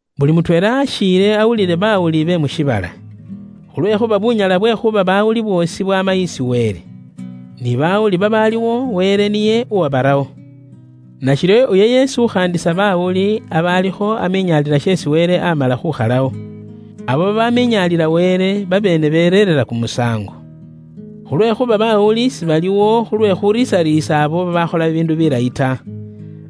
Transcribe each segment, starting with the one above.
Buli muundu akhiile awulile baawuli be mu shiibala. Khulwekhuuba bunyala bwe khuuba bawuli bwoosi bwaama isi Wele. Ni baawuli babaaliwo Wele niye uwabarawo. Nashiryo uyo yeesi ukhaandisa baawuli aba alikho amiinyalila sheesi Wele aamala khuukhalawo. Abo babaaminyaalila Wele, babeene bereerera kumusaango. Khulwekhuuba baawuli sibaliwo khulwe khuriisariisa abo babaakhola bibiindu bilayi ta.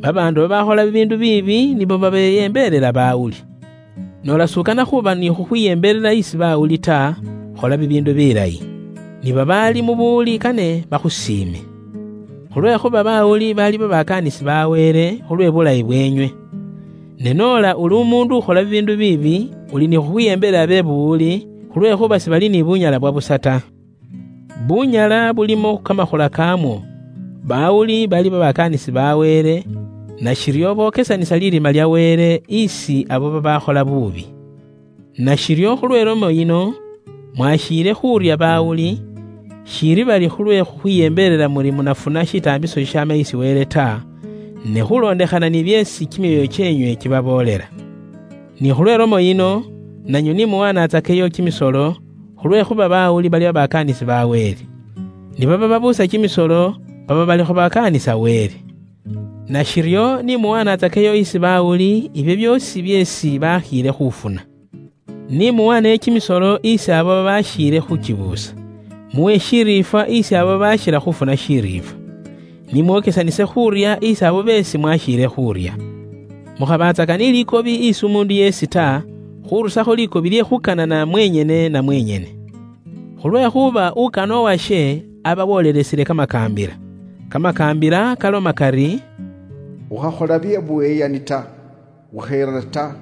Babaandu babaakhola bibiindu biibi nibo babeyembeelela bawuli. Noola s'ukana khuuba ni khukhwiyembelela isi baawuli ta, khola bibiindu bilayi. Ni babaali mu buwuli kane bakhusiime. Khulwekhuuba baawuli bali babakaanisi ba Wele, khulwe buulayi bweenywe. Ne noola uli umuundu ukhola bibiindu biibi, uli ni khukhwiyembelela be buwuli, khulwekhuuba sibali ni bunyala bwa busa ta. Bunyala bulimo kamakhula kaamwo: bawuli bali babakaanisi ba Wele, nashiryo bokesanisa lirima lya Wele, isi abo babaakhola buubi. Nashiryo khulwe ilomo yino, mwakhiile khuurya baawuli, shiili bari khulwe khukhwiyembelela muri munafuna shitaambiso shishaama isi Wele ta, ne khuulondekhana ni byeesi kimyoyo kyeenywe kibaboolela. Ni khulwe lomo yino, nanywe ni muwaanatsakeyo kimisolo, khulwekhuuba bawuli bali babakaanisi ba Wele. Ni baba babuusa kimisolo, baba balikho bakaanisa Wele. Nashiryo ni muwanatsakeyo isi bawuli ibyo byoosi byeesi bakhiile khufuna. Ni muwaaneyo kimisolo isi abo babakhiile khuukibuusa; muwe shiriifwa isi abo babakhila khuufuna shiriifwa. Ni mwokesanise khuurya isi abo beesi mwakhiile khuurya. Mukhabatsaka ni likobi isi umuundu yeesi ta, khurusakho likobi lye khuukanana mwenyene na mwenyene. Khulwekhuuba ukana uwashe aba wolelesile kamakaambila. Kamakaambila kaloma kari, “Ukhakhola bye buyeyani ta, ukheera ta,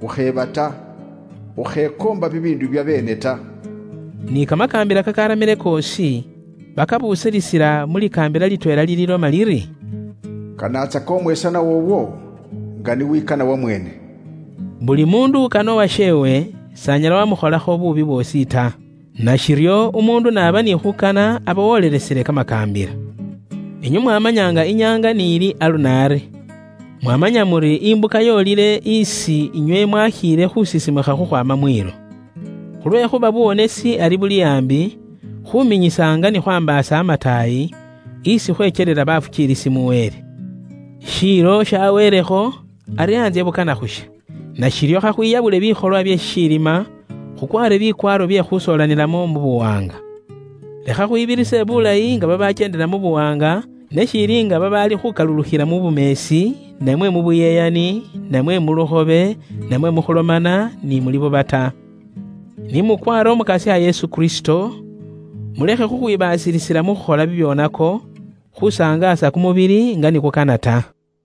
ukheeba ta, ukhekoomba bibiindu bya beene ta,” ni kamakaambila kakaramile koosi, bakabusilisila mu likaambila litweela liliiloma liri, “Kanatsaka umwesanwa woowo, nga ni wikana wamweene.” Buli muundu ukana uwasheewe, s'anyala wamukholakho buubi bwoosi ta. Nashiryo umuundu n'aba ni khuukana aba wolelesile kamakaambila. Inywe mwamanya nga inyaanga n'ili alunaari. Mwamanya muri imbuka yoolele isi inywe mwakhiile khusisimukha khukhwaama mwiilo. Khulwekhuuba buwonesi ari buli aambi, khuminyisa nga ni khwaambaasa amataayi, isi khwekyelela bafukiilisi mu Wele. Shiilo shaweelekho, ari antsye bukana khusha. Nashiryo kha khwiyabule bikholwa bye shishilima, khukwaare bikwaaro bye khusoolanilamo mu buwaanga. Lekha khwibirise bulayi nga babakyeendela mu buwaanga, ne shiili nga babaali khukalulukhila mu bumeesi, namwe mu buyeyani, namwe mu lukhobe, namwe mu khulomana ni mu libuba ta. Ni mukwaare Umukasya Yesu Kristo, mulekhe khukhwibaasilisila mu khukhola bibyoonako, khusangaasa kumubili nga ni kukana ta.